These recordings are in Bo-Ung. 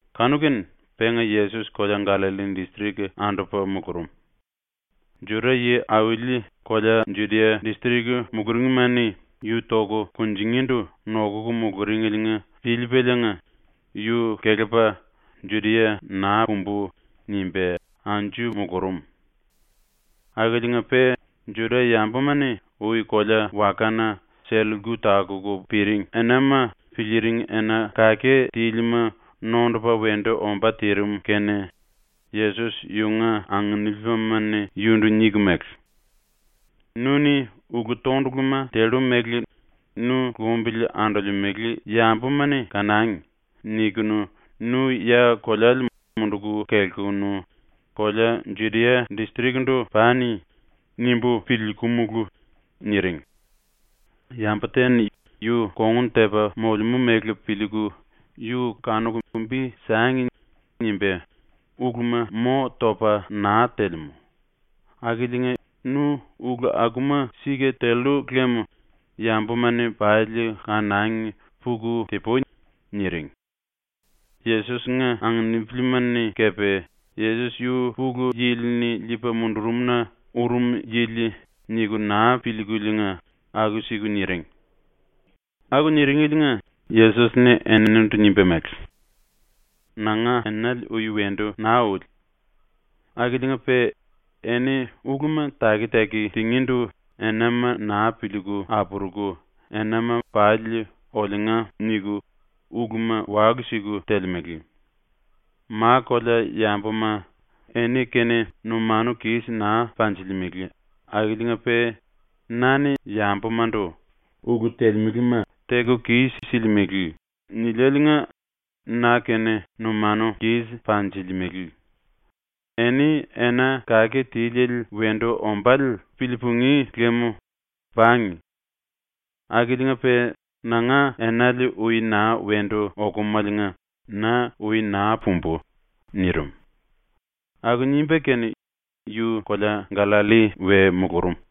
Kanu-kene penga Yesos kolea Gallalli distrik andupa mulurum. Juda yi-auli kolea Judia distrik muluringma-ni yu toku kunjingíndu nokuku muluringeliinga piliipaliinga yu kelepa ‘Judia naa pumbu.’ nimba anju mulurum. Akiliinga-pe Juda-yambuma-ni ui kolea-wakana sell-lku takuku piring enama piliiring ena kake tílima nondupa wendu ombá tirim kene Yesos yunga anginipilima-ni yundu niku mele: “‘Nu-ni ‘ulu-tonduluma tellu mele nu lumbili andolemele yambuma-ni kanangi.’ nikunu nu ya koleale munduku kelkunu kolea Judia distrik-ndu pani.’ nimbu piliikumulu.” niring. “Yambu te-ni ‘yu kongun tepa molemú mele piliiku yu kanuku bi sangi.’ nimba uluma mo topa naa telemú. Akiliinga nu ulu akuma sika tellu lem yambuma-ni pali kanangi puku ti-pui.” niring. Yesos-nga anginipilima-ni kepe ‘Yesos yu Pulu Yili-ni liipa mundurum-na urum yili.’ niku naa piliikuliinga aku-siku niring. Aku niringeliinga Yesos-ni eninindu nimba mele: “Nanga enale ui wendu naa uli. Akiliinga-pe eni uluma taki-taki tingíndu enama naa piliiku apuruku, enama pali “Oliunga” niku uluma walu-siku telemele. Ma-kolea yambuma eni-kene numanu kis naa panjilimele akiliinga-pe na-ni yambumandu “Ulu telemelema teku kis-silimele.” niliáliinga na-kene numanu kis panjilimele. Eni ena kake tiliele wendu ombále pilii-pungí lem pangi. Akiliinga-pe nanga enale ui naa wendu okumaliinga na ⸤ui⸥ naa pumbu.” nirim. Aku nimba kene yu kolea Gallalli we mulurum.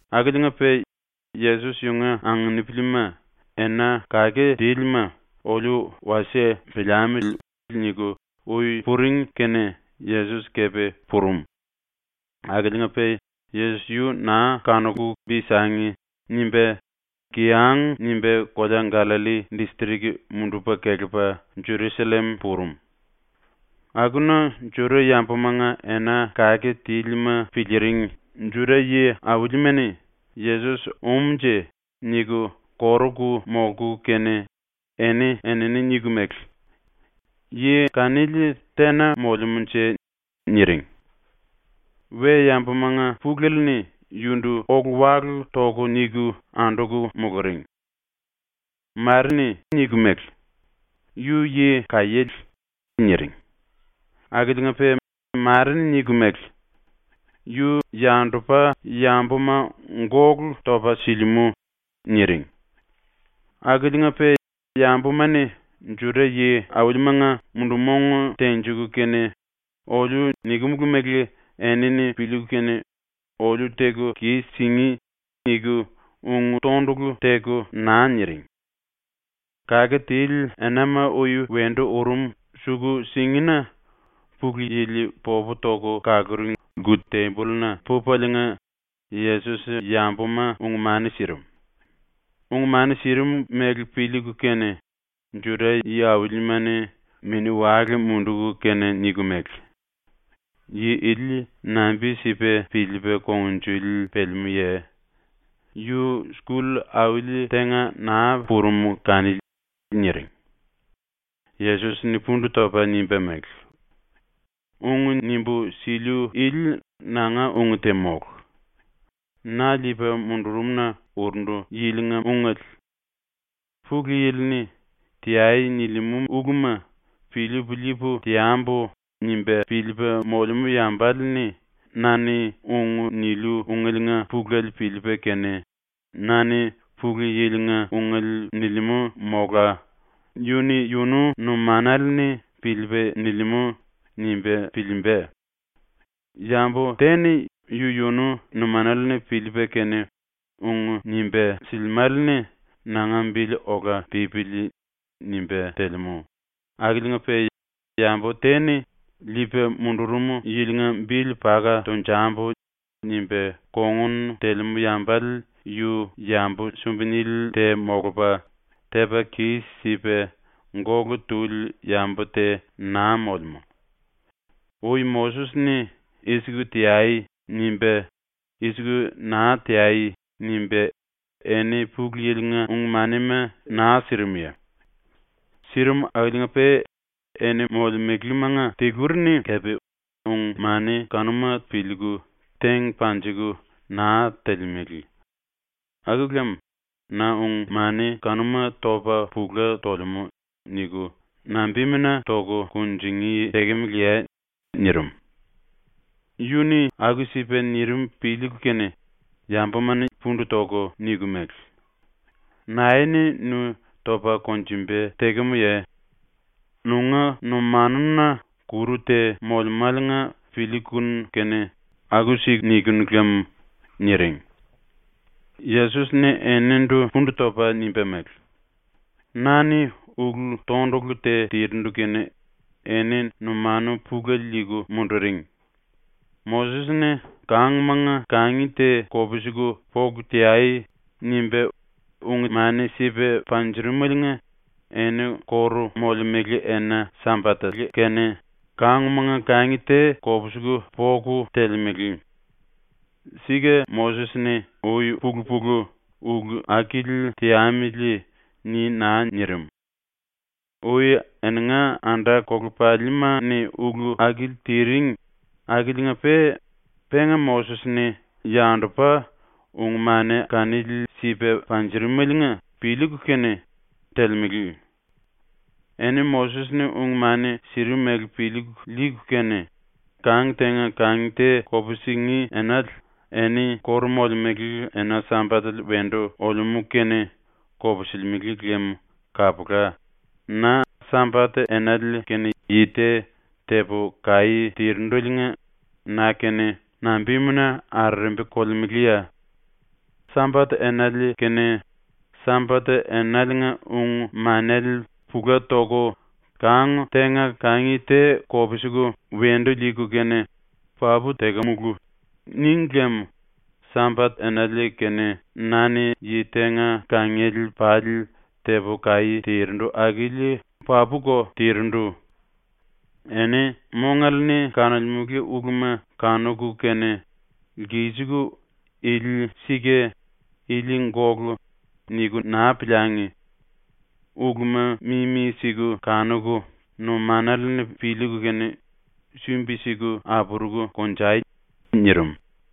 Akiliinga-pe Yesos yunga anginipilima ‘Ena kake tílima oliu wasie piliamili.’ niku ui puring kene Yesos kepe purum. Akiliinga-pe Yesos yu ‘naa kanuku bi sangi.’ nimba kiyang nimba ⸤kolea Gallalli distrik mundupa kelepa Jerusallem⸥ purum. Akuna Juda-yambumanga ena kake tílima piliiring Juda yi-aulima-ni ‘Yesos um-nje.’ niku koruku molku kene eni-enini niku mele: “Yi kanili tena molemúnje?” niring. we-yambumanga pulele-ni yundu ólu-walu toku niku anduku muluring. Mare-ni niku mele: “Yu yi kaiéle.” niring. Akiliinga-pe mare-ni niku mele: “Yu yandupa yambuma gólu topa silimú.” niring. Akiliinga-pe yambuma-ni Juda yi-aulimanga mundu-mong tenjiku kene ‘Oliu nikimulu mele enini piliiku kene oliu teku kis-singí.’ niku ung tondulu teku naa niring. Kake tili enama ui wendu urum suku-singina ⸤Pulu Yili popu toku kaluring⸥ lku-tembolluna pupaliinga Yesos yambuma ung-mani sirim. Ung-mani sirim mele piliiku kene Juda yi-aulima-ni mini-wale munduku kene niku mele: “Yi ili nambi-sipa piliipa kungnjuli pelemúye? Yu skull auli tenga naa purum kanili.” niring. Yesos-ni pundu topa nimba mele: “Ung nimbu siliu ili nanga ung te mólu. Na liipa mundurum-na urundu yilinga ungele. ‘Pulu Yili-ni “Teai.” nilimú uluma piliipu liipu teambu.’ nimba piliipa molemú yambale-ni na-ni ung niliu ungeliinga pulele piliipa kene, ‘Na-ni Pulu Yili-nga ungele nilimú.’ mola ‘Yu-ni yunu numanale-ni piliipa nilimú.’ nimba piliimba. Yambu te-ni yu-yunu numanale-ni piliipa kene ung nimba silimále-ni ‘Nanga bili ola pípili.’ nimba telemú, akiliinga-pe yambu te-ni ‘Liipa mundurum yilinga bili paka tonjambu.’ nimba kongun telemú yambale yu yambu sumbi-nili te molupa, tepa kis-sipa gólu tuli yambu te naa molemú. Ui Moses-ni ⸤“I-siku teai.” nimba “I-siku naa teai.” nimba⸥ eni ⸤Pulu Yili-nga⸥ ung-manima naa sirimye? Sirim akiliinga-pe eni molemelemanga tiluri-ni kepe ung-mani kanuma piliiku teng panjiku naa telemele. Aku lem ‘Na ung-mani kanuma topa pula tolemú.’ niku nambimuna toku kunjingí tekemeleye?” nirim. Yu-ni aku-sipa nirim piliiku kene yambuma-ni pundu toku niku mele: “Nae-ni nu topa konjumba tekemuye? Nunga numanuna kuru te molemáliinga piliikunu kene aku-siku nikinu lam.” niring. Yesos-ni eninindu pundu topa nimba mele: “Na-ni ulu-tondulu te tirindu kene eni numanu pulele liiku munduring. Moses-ni ‘Kangmanga kangi te kopsiku poku teai.’ nimba ung-mani sipa panjurumeliinga eni kóru molemele ena-Sambatele kene kangmanga kangi te kopsiku poku telemele. (Sika Moses-ni ui-pulu-pulu ‘ulu akili teamili.’ ni naa nirim. Ui eninga anda-kolepalima-ni ulu akili tiring, akiliinga-pe penga Moses-ni ⸤yandupa⸥ ung-mani kanili sipa panjurumeliinga piliiku kene telemele.) Eni Moses-ni ung-mani sirimele piliiku liiku kene kang tenga kangi te kupsingí enale eni kóru molemele ena-Sambatele wendu olemú kene kopsilimele lem kapula, na Sambat-enale kene yi te tepu kaí tirindeliinga na-kene nambimuna arerembi kolemeleye? ⸤Sambat-enale kene⸥ Sambat-enaliinga ung-manele pula toku ⸤kang tenga kangi te kopsiku wendu liiku kene ‘Papu tekemulu.’ níngi lem Sambat-enale kene na-ni yi tenga kangiele pali tepu kaí tirindu akili papuko tirindu.⸥ Eni mongale-ni kanolemele uluma kanuku kene lkisiku ‘Ili sika. Ili gólu.’ niku naa piliangi! Uluma mimi-siku kanuku numanale-ni piliiku kene sumbi-siku apuruku konjai.” nirim.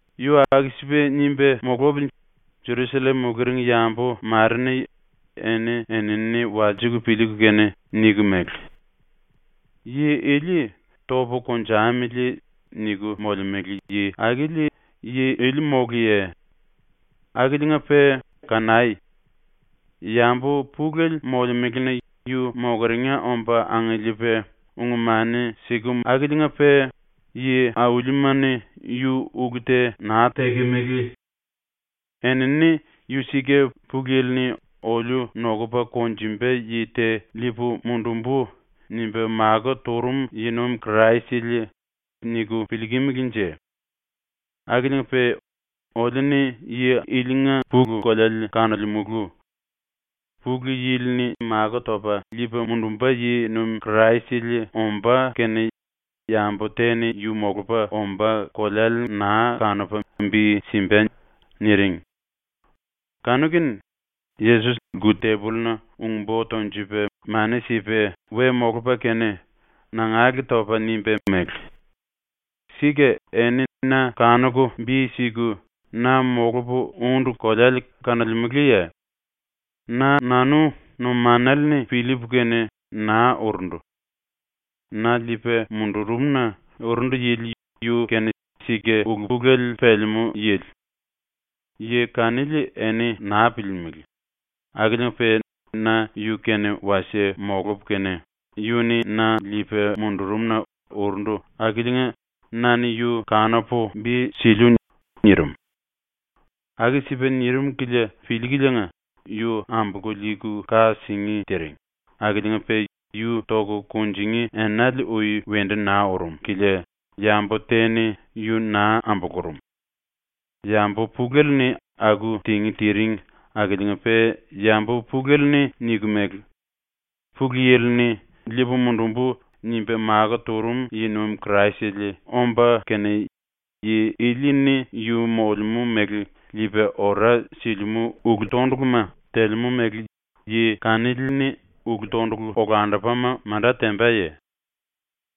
Yu aku-sipa nimba mulupili Jerusallem muluring yambu mare-ni eni-enini walsiku piliiku kene niku mele: “Yi ili ‘Topu konjamili.’ niku molemele yi akili yi ili móluye? Akiliinga-pe kanai. Yambu pulele molemelena yu mokeringa omba angiliipa ung-mani sikemu akiliinga-pe yi-aulima-ni yu ulu te naa tekemele. Enini ‘Yu sika Pulu Yili-ni ‘Oliu nokupa konjumba yi te liipu mundumbu.’ nimba makó turum yi-nuim Kraisele.’ niku piliikimilinje? Akiliinga-pe oliu-ni yi ilinga pulu-koleale kanolemulu. Pulu Yili-ni liipa mundumba yi-nuim Kraisele ombá kene yambu te-ni yu molupa ombá koleale naa kanupa bi simba.” niring. Kanu-kene Yesos lku-tembolluna ung-bo tonjupa mani sipa we molupa kene, nangale topa nimba mele: “Sika eni na kanuku bi siku, na molupu úndu koleale kanolemeleye? Na-nanu numanale-ni piliipu kene naa urundu. Na liipa mundurum-na urundu yili yu-kene sika ulu-pulele pelemú yili. Yi kanili eni naa piliilimili akiliinga-pe na yu-kene wasie molupu kene, yu-ni na liipa mundurum-na urundu akiliinga na-ni yu kanupu bi siliu.” nirim. Aku-sipa nirim kilia piliikuliinga yu ambolku liiku ka singí tiring akiliinga-pe yu toku kunjingí enale ui wendu naa urum kilia yambu te-ni yu naa ambulurum. Yambu pulele-ni aku tingí tiring akiliinga-pe yambu pulele-ni niku mele: “Pulu Yili-ni ‘Liipu mundumbu.’ nimba makó turum yi-nuim Kraisele omba kene, yi ili-ni yu molemú mele liipa ora silimú ulu-tonduluma telemú mele yi kanili-ni ulu-tondulu olandupama manda tembaye?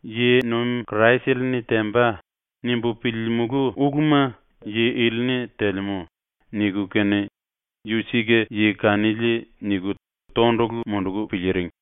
‘Yi-nuim Kraisele-ni temba.’ nimbu piliilimulu uluma yi ili-ni telemú.” niku kene ‘Yu sika yi kanili.’ niku tondulu munduku piliiring.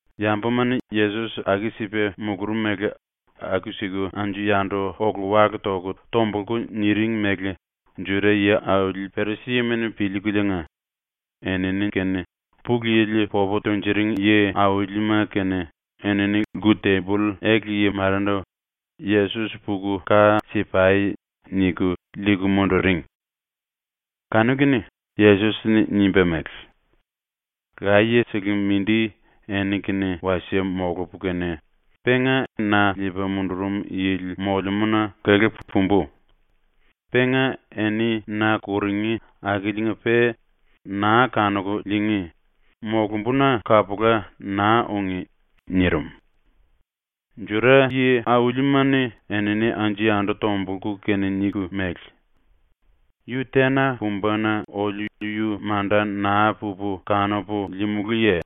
Yambuma-ni Yesos aku-sipa mulurum mele aku-siku anju-yandu ólu-walu toku tombulku niring mele Juda yi-auli Perisima-ni piliikuliinga, enini kene Pulu Yili popu tunjuring yi-aulima kene enini lku-temboll ele-yi marendu “Yesos puku ka si-pai!” niku liiku munduring. Kanu-kene Yesos-ni nimba mele: “Laye-sele mindi eni-kene wasie molupu kene, penga na liipa mundurum yili molemúna kelepu pumbu. Penga eni na kurungí akiliinga-pe naa kanuku liingí, molumbuna kapula naa ungí.” nirim. Juda yi-aulima-ni enini anju-yandu tombulku kene niku mele: “Yu tena pumba-na oliu yu manda naa pupu kanupu liimulúye?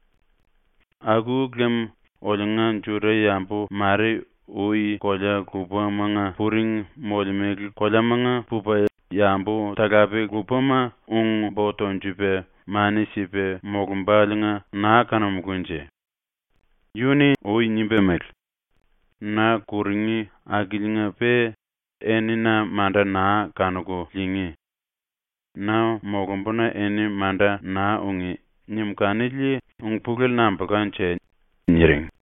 Aku lem oliunga Juda-yambu mare ui kolea lupamanga puring molemele koleamanga pupa yambu-talape lupama ung-bo tonjupa mani sipa molumbáliinga naa kanumulúnje? Yu-ni ui nimba mele: “Na kurungí akiliinga-pe eni na manda naa kanuku liingí. Na molumbuna eni manda naa ungí.” nim kanili ung-pulele nambulkanje?” niring.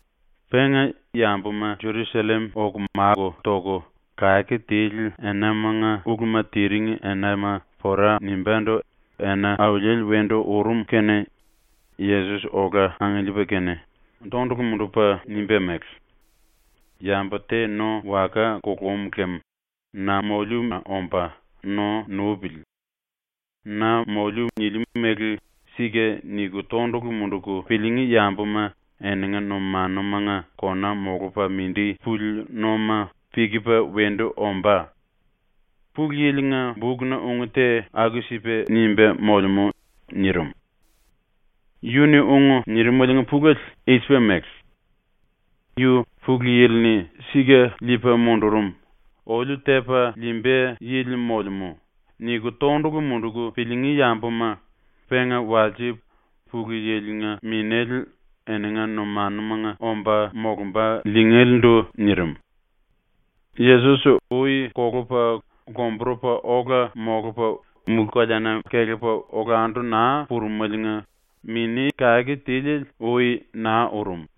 Penga, yambuma Jerusallem oku máku toku kake tili enamanga uluma tiring enama pora nimbándu ena auliele wendu urum kene Yesos ola angiliipa kene tondulu mundupa nimba mele: “Yambu te no waka kulum lem na moliuna omba no nupili. Na moliu niliu mele “Sika” niku tondulu munduku piliingí yambuma eninga numanumanga kona molupa mindi puli noma pikipa wendu ombá. Pulu Yili-nga bukna ung te aku-sipa nimba molemú.” nirim. Yu-ni ung nirimaliinga pulele i-sipa mele: “Yu Pulu Yili-ni sika liipa mundurum, oliu tepa liimba yili molemú.” niku tondulu munduku piliingí yambuma penga walse Pulu Yili-nga Minéle eninga numanumanga omba molumba liingélendu nirim. Yesos ui kolupa lomburupa ola molupa mulú-koleana kelepa olandu naa purumeliinga Mini ⸤Kake Tiliele⸥ ui naa urum.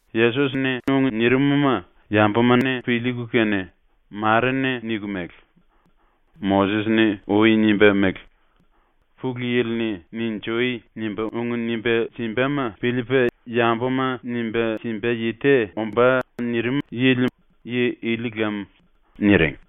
Yesos-ni ung nirim-ma yambuma-ni piliiku kene, mare-ni niku mele: “Moses-ni ui nimba mele: ‘Pulu Yili-ni “Ninjui!” nimba ung nimba simbama piliipa yambuma nimba simba yi te ombá.’ nirimele yi ili lam.” niring.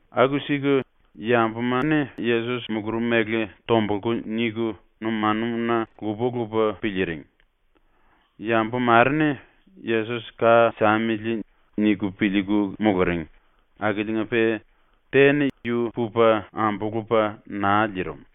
Aku-siku yambuma Yesos mulurum mele tombulku niku numanuna lupa-lupa piliiring. Yambu mare-ni ‘Yesos ka samili.’ niku piliiku muluring akiliinga-pe te-ni yu pupa ambulupa naa liirim.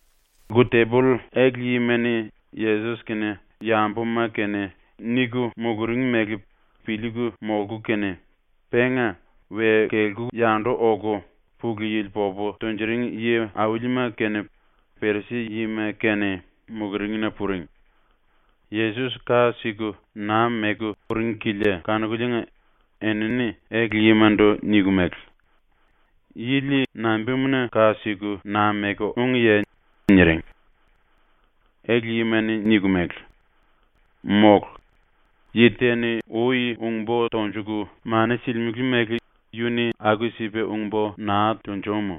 Lku-temboll ele-yima-ni Yesos kene yambuma kene niku muluring mele piliiku molku kene, penga we kelku yandu oku Pulu Yili popu tunjuring yi-aulima kene Perisi yima kene muluringna puring. Yesos ka siku naa meku uring kilia kanukuliinga enini ele-yimandu niku mele: “Yili nambimuna ⸤ka siku⸥ naa meku úngiye?” niring. Ele-yima-ni niku mele: “Mólu. Yi te-ni ui ung-bo tonjuku mani silimele mele yu-ni aku-sipa ung-bo naa tunjúmu.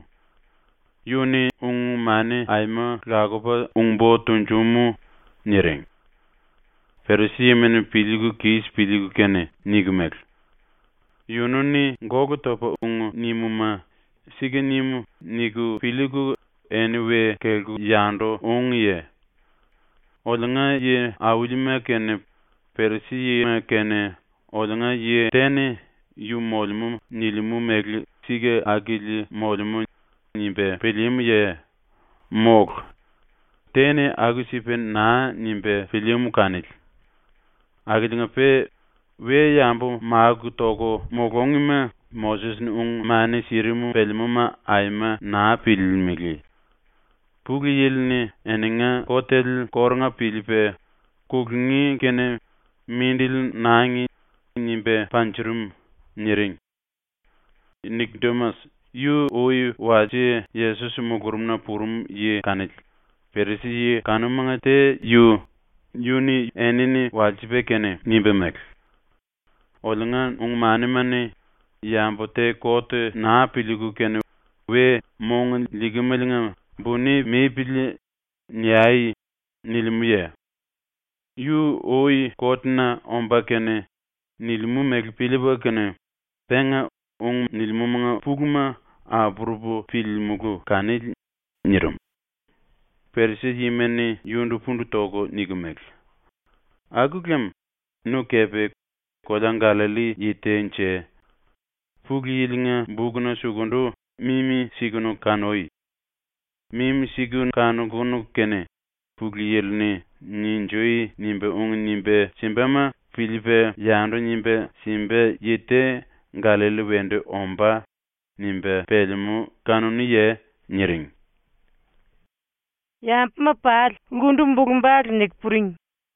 Yu-ni ung-mani aima lakupa ung-bo tunjúmu.” niring. Perisima-ni piliiku kis piliiku kene niku mele: “Yunu-ni gólu topa ung nimuma ‘Sika nim.’ niku piliiku eni we kelku yandu úngiye? Oliunga yi-aulima kene Perisi-yima kene oliunga yi te-ni “Yu molemú nilimú mele sika akili molemú.” nimba pilíímuye? ⸤Mólu, te-ni aku-sipa naa nimba pilíímu kanili.⸥ Akiliinga-pe we-yambu máku toku mulúngima Moses-ni ung-mani sirim pelemúma aima naa piliilimili. Pulu Yili-ni eninga kotele kórunga piliipa, kulungí kene ‘Mindili nangi.’ nimba panjurum.” niring. Nikodimas, yu ui walse Yesos mulurumna purum yi kanili, Perisi-yi kanumanga te yu, yu-ni enini walsipa kene nimba mele: “Oliunga ung-manima-ni ‘Yambu te kot naa piliiku kene we “Mong liikimeliinga buni mipili.” niai.’ nilimúye? Yu ui kot-na omba kene nilimú mele piliipu kene penga ung nilimúmanga puluma apurupu piliimulú kanili.” nirim. Perisi-yima-ni yundu pundu toku niku mele: “Aku lem nu kepe kolea Gallalli yi te-nje? Pulu Yili-nga bukna sukundu mimi-sikunu kanui. Mimi-siku kanukunu kene, ‘Pulu Yili-ni “Ninjui!” nimba ung nimba simbama piliipa yandu nimba simba yi te Gallalli wendu ombá.’ nimba pelemú kanuníye?” niring. Yambuma pali lkundu bulu-bale niku puring